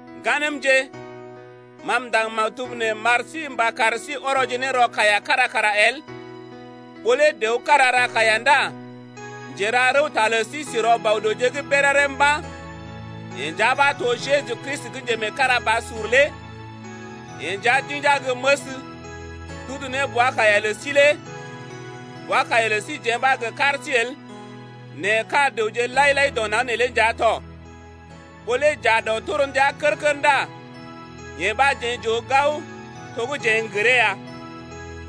Ŋganəmje, ma m’ndaŋg maktub nee m’ar sí mba kar sí ɔrɔje ne rɔ kaiya kára kara el. Ɓó lé dəw kára ra kaiya ndá njera rəwta lə sí si rɔ Bɔ-dəwje’g béréré mba̰, yeḛ nja ɓa to Jeju Kristi gə́ njemeekarabasur lé. Yeḛ nja d’inja gə́ məs, d’udu ne bwa-kaiya lə sí lé, bwa-kaiya lə síjeḛ ɓa gə kar sí el, nɛ ka̰ dəwje lai-lai dɔ naŋg neelé nja tɔ. Ɓó lé j’aa dɔ torndia kər-kər ndá yee ɓa jeḛ j’oo gao, to gə́ jeḛ n’gəree ya.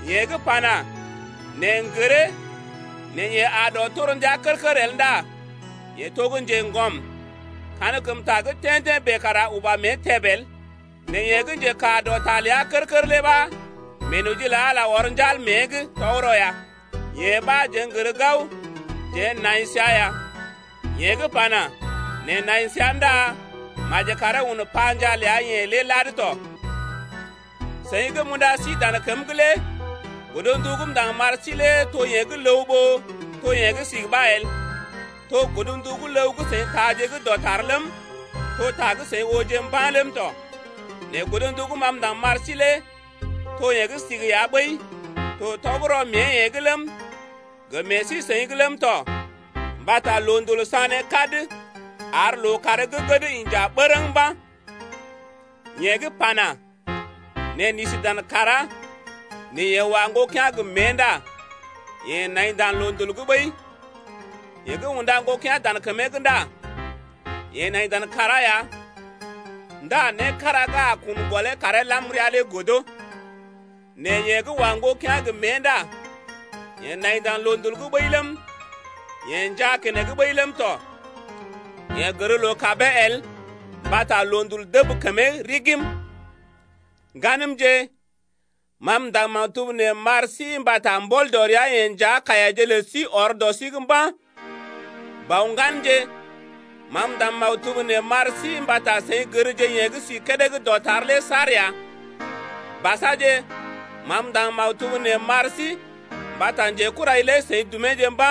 Yeḛ gə́ pana: Neḛ n’gəree, nɛ yeḛ aa dɔ torndia kər-kər el ndá yeḛ to gə́ njeŋgɔm, kankəmta gə́ tḛ́-tḛ́ bèe kara uba mée təb el. Nɛ yeḛ gə́ njekaa dɔ ta ləa kər-kər lé ɓa meenoji lə Ala ɔr njal mée’g, tɔgərɔ ya. Yee ɓa jeḛ n’gər gao jeḛ nai səa ya. Yeḛ gə́ pana: Neḛ nai səa ndá maji karee un panjaa ləa-yeḛ lé lad tɔ. Seḭ gə́ m’unda sí dan kəm’g lé godndu gə́ m’ndaŋg m’ar sí lé to yee gə́ ləw ɓó to yee gə́ sigi ɓa el. To godndu gə́ ləw gə́ seḭ taaje gə́ dɔtar ləm, to ta gə́ seḭ ooje mba̰ ləm tɔ. Nɛ godndu gə́ sigi gə́ ma m’ndaŋg m’ar sí lé to yee gə́ sigi ya ɓəi, to tɔgərɔ mée-yeḛ’g ləm, gə meḛ sí-seḭ’g ləm tɔ, mbata loondul sané kad ar lookàr gə́ gəd inja bərəŋ mba̰. Yeḛ gə́ pana: Neḛ n’isi dan kàrá, nɛ yeḛ wa ŋgokea̰ gə mée ndá yeḛ nai dan loondul’g ɓəi. Yeḛ gə́ unda ŋgokea̰ dan kəmee’g ndá yeḛ nai dan kàrá ya ndá né kára gə́ a kun gɔlee karee lam rəa lé godo. Nɛ yeḛ gə́ wa ŋgokea̰ gə mée ndá yeḛ nai dan loondul’g ɓəi ləm, yeḛ njaa keneŋ ɓəi ləm tɔ. Yeḛ gər loo-kabee el mbata loondul dəb kəmee rigim. Ŋganəmje, ma m’ndaŋg maktub nee m’ar sí mbata mbɔl dɔ ria-yeḛ nja kaiyaje lə sí ɔr dɔ sí’g mba̰. Bɔ-ŋganje, ma m’ndaŋg maktub nee m’ar sí mbata seḭ gərje yeḛ gə́ si kédé gə́ dɔtar lé saar ya. Basaje, ma m’ndaŋg maktub nee m’ar sí mbata njekurai lé seḭ dumeje mba̰.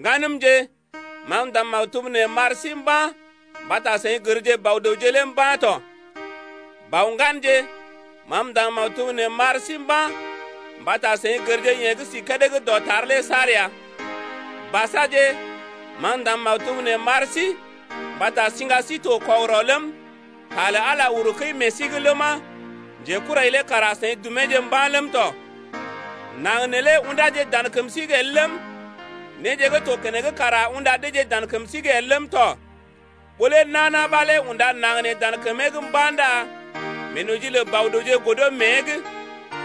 Ŋganəmje, ma m’ndaŋg maktub nee m’ar sí mba̰ mbata seḭ gərje Bɔ-dəwje lé mba̰ tɔ. Bɔ-ŋganje, ma m’ndaŋg maktub nee m’ar sí mba̰ mbata seḭ gərje yeḛ gə́ si kédé gə́ dɔtar lé saar ya. Basaje, ma m’ndaŋg maktub nee m’ar sí mbata siŋga sí to kɔgərɔ ləm, ta lə Ala uru kəi meḛ sí’g ləma, njekurai lé kara seḭ dumeeje mba̰ ləm tɔ. Naŋg neelé ṵdáje dan kəm sí’g el ləm, néje gə́ to keneŋ kara unda deeje dan kəm sí’g el ləm tɔ. Ɓó lé nana ɓa lé unda naŋg nee dan kəmee’g mba̰ ndá meenoji lə Bɔ-dəwje godo mée’g.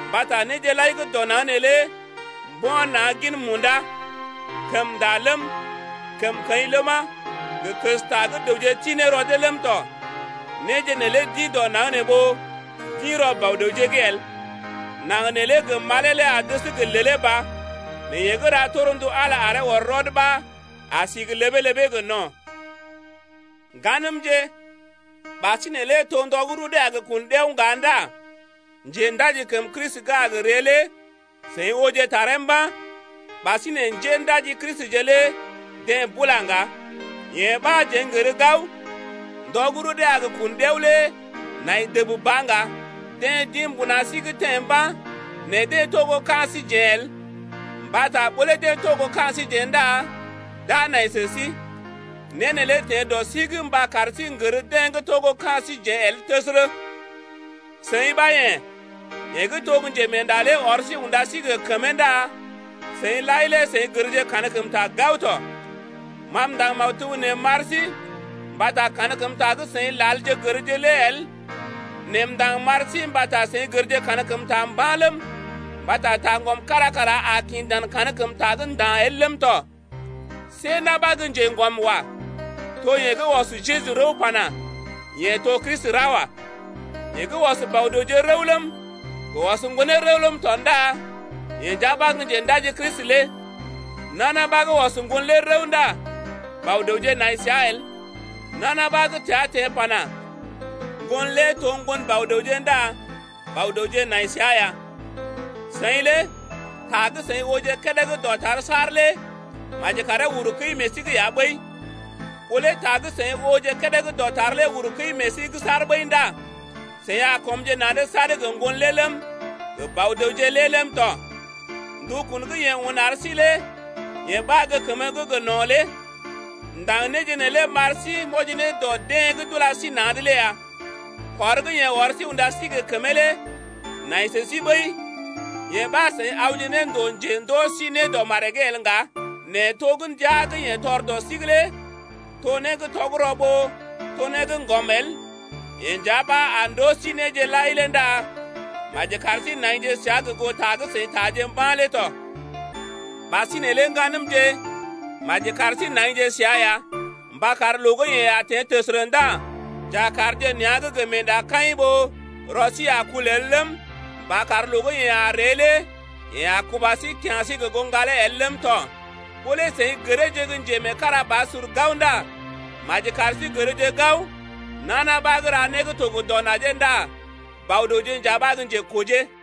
Mbata néje lai gə́ dɔ naŋg neelé mbo̰ na̰ gin munda: kəmnda ləm, kəmkəḭ ləma, gə kəsta gə́ dəwje ti ne rɔ dee ləm tɔ, néje neelé d’ḭ dɔ naŋg nee ɓó d’ḭ rɔ Bɔ-dəwje’g el. Naŋg neelé gə malee lé a dəs gə lèlé ba, nɛ yeḛ gə́ ra torndu Ala aree ɔr rɔd ɓa a si gə ləbee-ləbee gə no̰. Ŋganəmje, ɓasinè lé to ndɔ gə́ rudee a gə kun ɗiao ŋga ndá njendaji kəm Kristi gə́ a gə ree lé seḭ ooje taree mba̰, ɓasinè njéndaji Kristije lé deḛ bula ŋga. Yee ɓa jeḛ n’gər gao, ndɔ gə́ rudee a gə kun ɗiao lé nai dəb ba ŋga. Deḛ d’ḭ mbuna sí’g teḛ mba̰, nɛ deḛ to gə́ ka̰ síjeḛ el, mbata ɓó lé deḛ to gə́ ka̰ síjeḛ ndá d’a nai sə sí. Né neelé teḛ dɔ sí’g mba kar sí n’gər deḛ gə́ to gə́ ka̰ síjeḛ el təsərə. Seḭ ɓa yḛ̀, yeḛ gə́ to Njemeenda lé ɔr sí unda sí gə kəmee ndá seḭ lai lé seḭ gərje kankəmta gao tɔ. Ma m’ndaŋg maktub nee m’ar sí mbata kankəmta gə́ seḭ lalje gərje lé el nɛ m’ndaŋg m’ar sí mbata seḭ gərje kankəmta mba̰ ləm, mbata taŋgɔm kára kara a kḭ dan kankəmta’g nda̰ el ləm tɔ. See na̰ ɓa gə́ njeŋgɔm wa, to yeḛ gə́ ɔs Jeju rəw pana: Yeḛ to Kristi ra wa. Yeḛ gə́ ɔs Bɔ-dəwje rəw ləm, gə ɔs Ŋgonee rəw ləm tɔ ndá yeḛ nja ɓa gə́ Njendaji Kristi lé. Nana ɓa gə́ ɔs Ŋgon lé rəw ndá Bɔ-dəwje nai səa el. Nana ɓa gə́ təa teḛ pana: Ŋgon lé to ŋgon Bɔ-dəwje ndá Bɔ-dəwje nai səa ya. Seḭ lé ta gə́ seḭ ooje kédé gə́ dɔtar saar lé maji karee uru kəi meḛ sí’g ya ɓəi. Ɓó lé ta gə́ seḭ ooje kédé gə́ dɔtar lé uru kəi meḛ sí’g saar ɓəi ndá seḭ a kɔmje na̰’d sad gə Ŋgon lé ləm, gə Bɔ-dəwje lé ləm tɔ. Ndukun gə́ yeḛ un ar sí lé yee ɓa gə́ kəmə gə́ gə no̰ lé. M’ndaŋg néje neelé m’ar sí m’wɔji ne dɔ deḛ gə́ d’ula sí na̰’d lé ya. Kɔr gə́ yeḛ ɔr sí unda sí gə kəmee lé nai sə sí ɓəi, yee ɓa seḭ awje ne ndòo njendoo sí né dɔ maree’g el ŋga, nɛ to gə́ ndia gə́ yeḛ tɔr dɔ sí’g lé to né gə́ tɔgərɔ ɓó to né gə́ ŋgɔm el, yeḛ nja ɓa a ndoo sí néje lai lé ndá maji kar sí naije səa gə goo ta gə́ seḭ taaje mba̰ lé tɔ. Ɓasinè lé ŋganəmje, maji kar sí naije səa ya mba kar loo gə́ yeḛ a teḛ təsərə ndá j’a kaarje nea̰’g gə meendakaḭ ɓó rɔ sí a kul el ləm, mba kar loo gə́ yeḛ a ree lé yeḛ a kuba sí kya̰ sí gə goo ŋgalee el ləm tɔ. Ɓó lé seḭ gəreeje gə́ njemeekarabasur gao ndá maji kar sí gərje gao nana ɓa gə́ ra né gə́ to gə dɔ najee ndá Bɔ-dəwje nja ɓa gə́ njekojee.